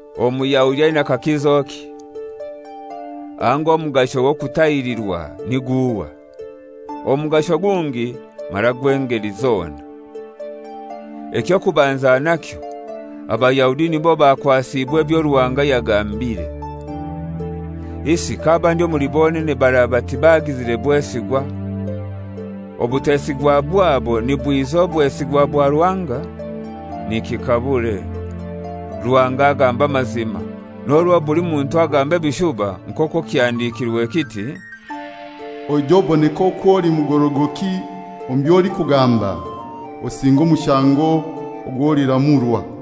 Omuyahudi aina kakizoki? Anga omugasho gw'okutahirirwa ni guhai? Omugasho gungi mara gw'engeli zona. Eky'okubanza nakyo, Abayahudi nibo bakwasiibwe ebyo Ruhanga yagambire. Isi k'abandi omuli bonene baraba tibagizire bwesigwa? Obutesigwa bwabo nibwiza obwesigwa bwa Ruhanga? Nikikabure! Ruhanga agamba amazima, n'orwo buli muntu agamba ebishuba, nk'okwo kihandikirwe kiti: «Oije oboneke okwo oli mugorogoki omu by'olikugamba, osinge omushango ogw'oliramurwa.»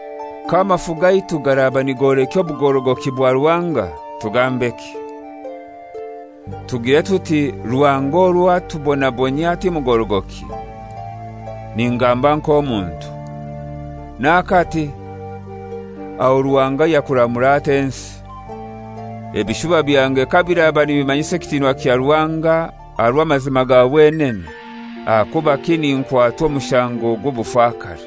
K'amafu gaitu garaba nigolekya obugorogoki bwa Ruhanga, tugambeki? Tugiire tuti Ruhanga orwo atubonabonyia ti mugorogoki? (Ningamba nk'omuntu). N'akati! Aho Ruhanga yakuramura atai ensi? Ebishuba byange kabiraba nibimanyisa ekitinwa kya Ruhanga aha rw'amazima ga wenene, ahakubaki ninkwatwa omushango gw'obufakare?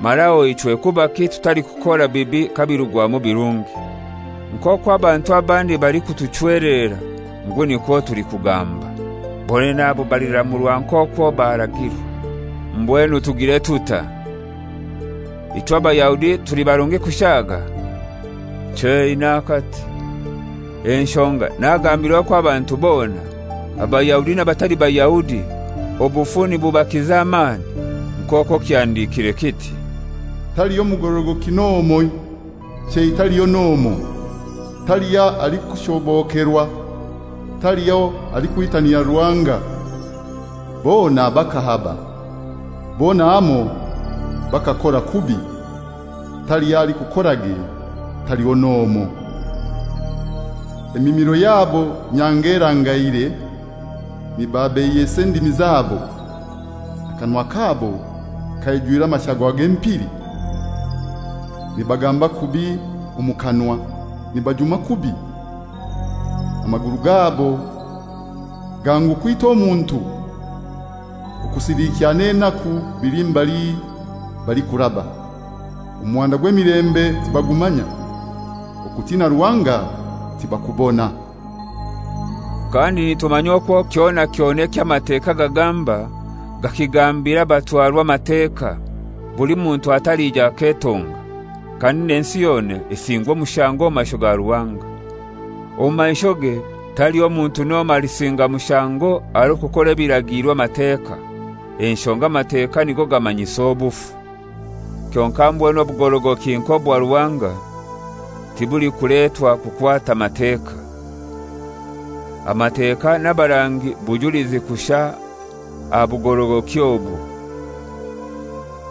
Mara aho ichwe kubaki tutalikukora bibi kabirugwamu birungi? Nk'okwo abantu abandi balikutuchwelerera ngu nikwo tulikugamba. Bonene abo baliramurwa nk'okwo baragirwa. Mbwenu tugire tutai? Ichwe Abayahudi tuli barungi kushaaga? Chei, n'akati; enshonga nagambire okwo abantu bona, Abayahudi n'abatali Bayahudi, obufu nibubakiza amani, nk'okwo kihandikire kiti, «Taliho mugorogoki n'omoi, chei taliho n'omoi; taliho alikushobokerwa, taliho alikwitanira Ruhanga. Bona bakahaba, bona hamoi bakakora kubi; taliho alikukorage, taliho n'omoi. Emimiro yabo nyanga erangaire, nibabeiyesa endimi zabo. Akanwa kabo kaijwire amashagwa g'empili. Nibagamba kubi omu kanwa, nibajuma kubi. Amaguru gabo gangu kwita omuntu okusiliikya n'enaku bili mbali balikuraba, omuhanda gw'emilembe tibagumanya. Okutina Ruhanga tibakubona.» Kandi nitumanya okwo kyona kyona eky'Amateka gagamba, gakigambira abatwarwa Amateka, buli muntu atalija aketonga, kandi n'ensi yona esingwe omushango omu maisho ga Ruhanga. Omu maishoge taliho muntu n'omoi alisinga mushango aha rw'okukora ebiragiirwe Amateka; enshonga Amateka nigo gamanyisa obufu. Kyonkai mbwenu obugorogoki nk'obwa Ruhanga tibulikuletwa kukwata Mateka; Amateka n'abarangi bujulizi kushai aha bugorogoki obwo.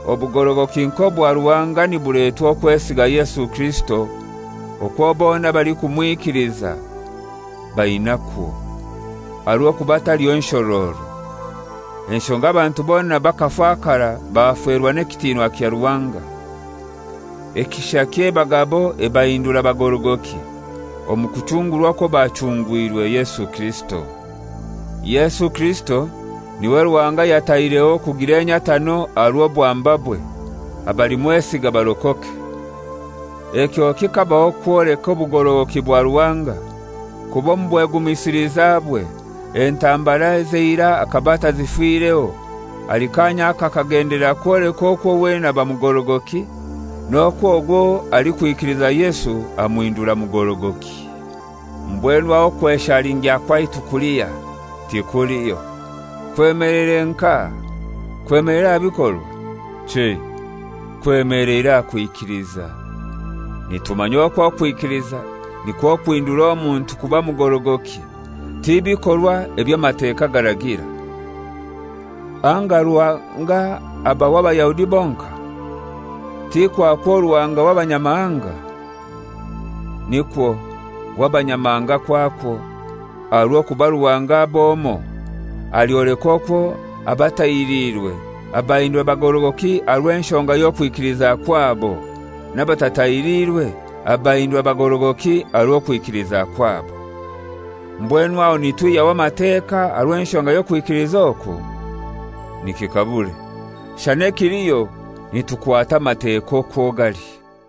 Obugorogoki nk'obwa Ruhanga nibuletwa okwesiga Yesu Kirisito okwo bona abalikumwikiliza bainakwo. Aha rw'okuba taliho nshororo; enshonga abantu bona bakafakara baferwa n'ekitinwa kya Ruhanga. Ekishakye eba gabo ebahindura bagorogoki, omu kuchungurwa okwo bachungwirwe Yesu Kirisito. Yesu Kirisito n'iwe Ruhanga yataireho kugira enyatano aha rw'obwambabwe, abalimwesiga barokoke. Ekyo kikabaho kwoleka obugorogoki bwa Ruhanga, kuba omu bwegumisilizabwe, entambara ez'eirai akaba atazifireho; ahali kaanya aka akagendelera kwoleka okwo wenene aba mugorogoki n'okwo ogwo alikwikiliza Yesu amuhindura mugorogoki. Mbwenu aho okweshalingya kwaitu kulihai? Tikuliho. Kwemeleire nkahai? Kwemeleire aha bikorwa? Chei; kwemeleire aha kwikiliza. Nitumanya okwo okwikiliza nikwo kuhindura omuntu kuba mugorogoki, ti bikorwa eby'Amateka garagira. Anga Ruhanga aba w'Abayahudi bonkai? Ti kwakwo Ruhanga w'Abanyamahanga? Nikwo, w'Abanyamahanga kwakwo, aha rw'okuba Ruhanga ab'omoi; alyoleka okwo abatahiriirwe abahindura bagorogoki aha rw'enshonga y'okwikiliza kwabo n'abatatahirirwe abahindura bagorogoki aha rw'okwikiliza kwabo. Mbwenu aho nitwihyaho Amateka aha rw'enshonga y'okwikiliza oku? Nikikabure! Shana ekiliho nitukwata Amateka okwo gali.